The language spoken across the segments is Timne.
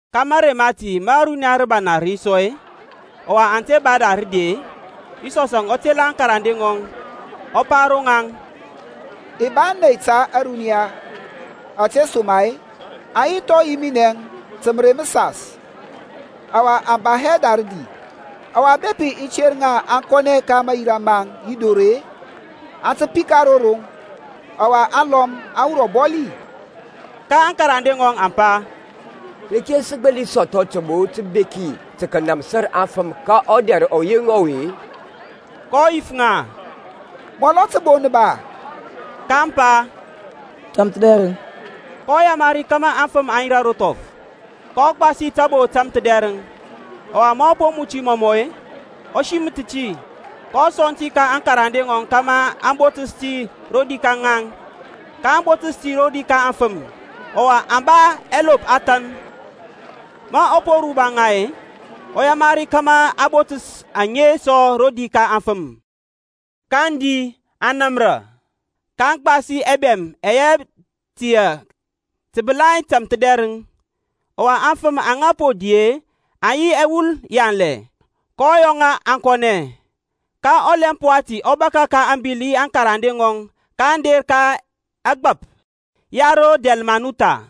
Ka mȧrey mati ma runiya rəbana rə yi sɔ-e, ɔwa aŋ te ba da rədi-e, Yisɔsȧŋ ɔ tela aŋkarande ŋɔŋ, ɔ pa ro ŋaŋ, I ba ȧney ta ȧruniya ȧtesoma-e aŋ yi thɔŋ yi minɛ ta mərey məsas, ɔwa aŋ ba hɛ da rədi. Ɔwa bepi i ter ŋa aŋ kɔnɛ ka mayira maŋ yi dor-e, aŋ tə pika ro roŋ, ɔwa aŋlɔm aŋ wur ɔbɔli. Ka aŋkarande ŋɔŋ aŋ pa, Reke sə gbəli sɔthɔ təbo təbeki tə kənȧmsir aŋfəm ka ɔdɛr ɔyeŋ ɔwe-e? kɔ yif ŋa, Mɔlɔ təbo nə ba-a? kaŋ pa, Tȧmthədɛrəŋ. kɔ yamari aŋfəm kȧmȧ aŋ yirȧ ro thɔf, kɔ gbasi tȧbo tȧmthədɛrəŋ, ɔwa ma ɔ po muti məmə-e, ɔ siməth ti, kɔ sɔŋ ti ka aŋkarande ŋɔŋ kȧmȧ aŋ botəs ti rodi ka ŋaŋ; kaŋ botəs ti rodi ka aŋfəm. Ɔwa aŋ ba ɛlop ɛthan. Ma ɔ po ruba ŋa-e, ɔ yamari kȧmȧ aŋ botəs aŋe sɔ rodi ka aŋfəm. kaŋ di, aŋ namra; kaŋ gbas ɛbɛm ɛyɛ tiyȧ təbəlai tȧmthədɛrəŋ. Ɔwa aŋfəm aŋa po di-e aŋ yi ɛwul yanlɛ. Kɔ yɔ ŋa aŋ kɔnɛ. Ka ɔlɛmp wati ɔ bȧkȧ ka ȧŋbil yi aŋkarande ŋɔŋ kaŋ der ka ɛgbap ya ro Dalmanutha.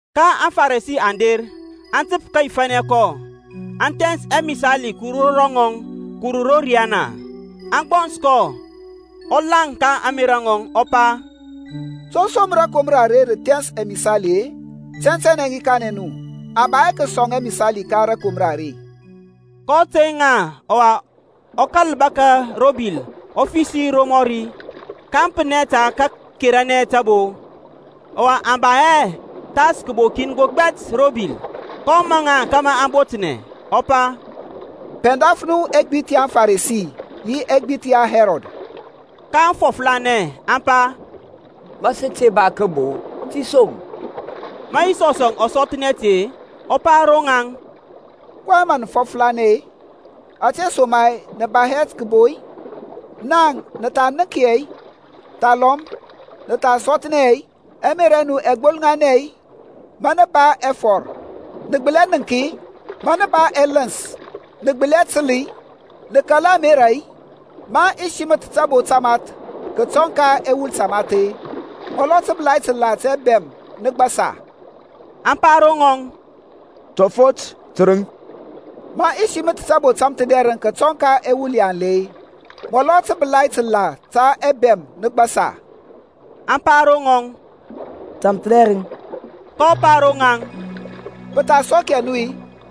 Ka aŋFarisi aŋ der, aŋ təp kəyifȧnɛ kɔ, aŋ thɛns amisali kəwur ro ŋɔŋ kəwur ro riyana, aŋ gbɔns kɔ. Ɔ laŋ ka ȧŋmerȧ ŋɔŋ ɔ pa, To som rȧkomra are rə thɛns amisali-e? Tɛntɛnɛ i kanɛ nu, a ba hɛ kəsɔŋ amisali ka rȧkomra are. kɔ tey ŋa ɔwa ɔ kȧl bȧkȧ ro bil ɔ fəsi romɔri. kaŋ pənɛ tə kəkeranɛ təbo; ɔwa aŋ ba hɛ pəthas kəbo kin gbɛt ro bil. kɔ maŋ ŋa kȧmȧ aŋ botnɛ, ɔ pa, Pɛndaf nu ɛgbith ya aŋFarisi yi ɛgbith ya Hɛrɔd. kaŋ fɔflanɛ, aŋ pa, Ma sə te ba kəbo, tesom. Ma Yisɔsȧŋ ɔ sɔthnɛ ti-e, ɔ pa ro ŋaŋ, kɔyɛŋ mə nə fɔflanɛ-e? Ȧtesoma-e nə ba hɛ kəbo-i? Naŋ nə tha nənk hɛ-i, thalɔm nə tha sɔthnɛ hɛ-i? Ɛmerȧ ɛ nu ɛ gbolŋanɛ-i? Ma nə ba ɛfɔr nə gbəli hɛ nəŋk-i? Ma nə ba ɛləns nə gbəli hɛ təl-i? Nə kala hɛ amera-i? Ma i siməth tabo tamath kətɔŋ ka ɛwul tamath-e, amɔlɔ təbəlai təlȧ ta ɛbɛm nə gbasi-a? Aŋ pa ro ŋɔŋ, Tɔfɔt tərəŋ. Ma i siməth tabo tȧmthədɛrəŋ kətɔŋ ka ɛwul yanlɛ-e, amɔlɔ təbəlai təlȧ ta ɛbɛm nə gbasi-a? Aŋ pa ro ŋɔŋ, Tȧmthədɛrəŋ. kɔ pa ro ŋaŋ, Pə tha sɔk hɛ nu-i?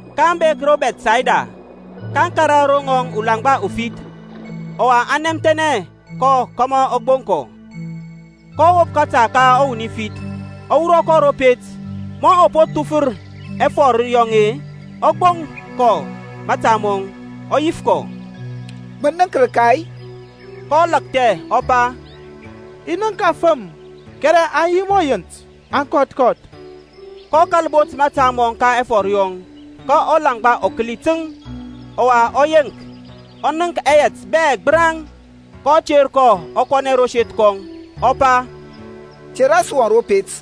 kaŋ bek ro Bɛthsayda. Kaŋ kȧrȧ ro ŋɔŋ ulaŋgba ufith, ɔwa aŋ nɛmthɛnɛ kɔ kȧmȧ ɔ gboŋ kɔ. kɔ wop kȧta ka ɔwuni fith, ɔ wurɔ kɔ ro pet. Ma ɔ po thufər ɛfɔr yɔŋ-e, ɔ gboŋ kɔ mȧta mɔŋ, ɔ yif kɔ, Mə nənk rəka-i? kɔ lakthɛ, ɔ pa, I nənk afəm kɛrɛ aŋ yi mɔ yint, aŋ kɔth kɔth. kɔ kȧl bot mȧta mɔŋ ka ɛfɔr yɔŋ, ka ɔlaŋgba ɔ kəli təŋ, ɔwa ɔ yeŋk, ɔ nənk ɛyɛt bɛ gbəraŋ. kɔ ter kɔ ɔ kɔnɛ ro seth kɔŋ, ɔ pa, Te ras wɔŋ ro pet.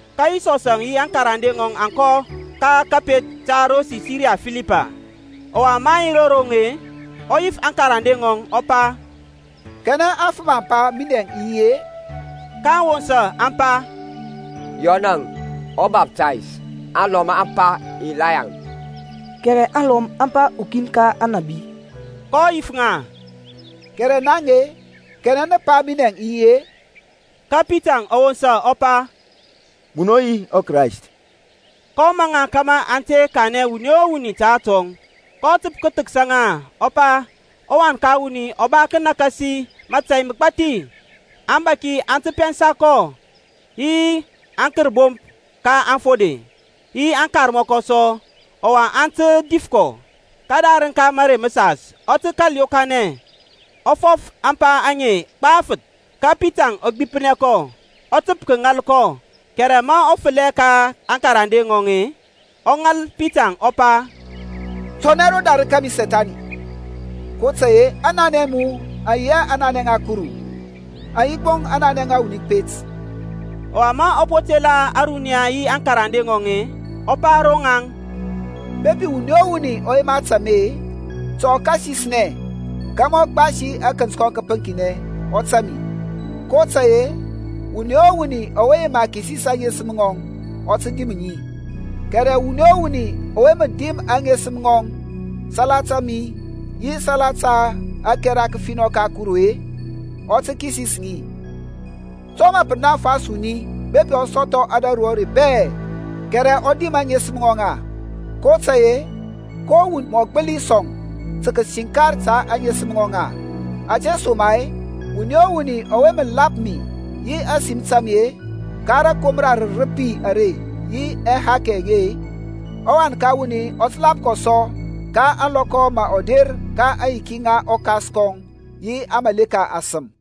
Ka Yisɔsȧŋ yi aŋkarande ŋɔŋ aŋ kɔ ka kȧpet ta ro Sisiriya Filipay; ɔwa maŋ yi ro roŋ-e, ɔ yif aŋkarande ŋɔŋ, ɔ pa, Kanɛ aŋfəm aŋ pa minɛŋ i yi-e? kaŋ wosa aŋ pa, Yɔnȧŋ, ɔBaftays, alɔm aŋ pa, Ilayaŋ, kɛrɛ aŋlɔm aŋ pa ukin ka aŋnabi. kɔ yif ŋa, Kɛrɛ naŋ-e, kanɛ nə pa minɛŋ i yi-e? Ka Pitaŋ ɔ wosa ɔ pa, Munɔ mə yi ɔKrayst. kɔ maŋ ŋa kȧmȧ aŋ te kanɛ wuni o wuni ta atɔŋ. kɔ təp kəthəksa ŋa kəpa ɔ Wan ka wuni ɔ ba kənakasi mȧtȧy məgbathi; aŋbȧki aŋ tə pɛnsa kɔ, yi aŋkərbomp ka aŋfode, yi aŋkarmɔkɔ sɔ, ɔwa aŋ tə dif kɔ, kədarəŋ ka mərey məsas ɔ tə kȧl yokanɛ. Ɔ fɔf ȧŋpa aŋe gbafəth. Ka Pitaŋ ɔ gbipnɛ kɔ, ɔ təp kəŋȧl kɔ. Kɛrɛ ma ɔ fəlɛ ka aŋkarande ŋɔŋ-e, ɔ ŋal Pitaŋ ɔ pa, Kɔnɛ rodarəŋ kȧmi Sethani; kotȧy-e aŋnanɛ a mu aŋ yi hɛ aŋnanɛ ŋa Kuru, aŋ yi gbo aŋnanɛ ŋa wuni kəpet. Ɔwa ma ɔ po tela ȧruniya yi aŋkarande ŋɔŋ-e, ɔ pa ro ŋaŋ, Bepi wuni o wuni ɔ yema tȧŋ mi-e, ta ɔ kasisnɛ, kȧmȧ ɔ gbasi akənt kɔŋ kəpəŋkinɛ, ɔ tȧŋ mi. kotȧy-e wuni o wuni ɔwe yema kisis aŋesəm ŋɔŋ, ɔ tə dim ŋi, kɛrɛ wuni o wuni ɔwe mə dim aŋesəm ŋɔŋ salata mi yi salata ȧkɛra kəfinɔ ka Kuru-e, ɔ tə kisis ŋi. To mə pə munafa wuni bepi ɔ sɔthɔ ȧdȧru bɛ-e, kɛrɛ ɔ dim aŋesəm ŋɔŋ-a? kotȧy-e ko wuni mɔ gbəli sɔŋ tə kəsiŋkar ta ȧŋesəm ŋɔŋ-a? Ȧtesoma-e wuni o wuni ɔwe mə lap mi yi ȧsim ta mi-e, ka rȧkomra rərəpi are yi ɛhakɛ ɛye-e; ɔWan ka wuni ɔ tə lap kɔ sɔ, ka ȧŋlɔkɔ ma ɔ der ka aŋyiki ŋa ɔKas kɔŋ yi aŋmȧleka asəm.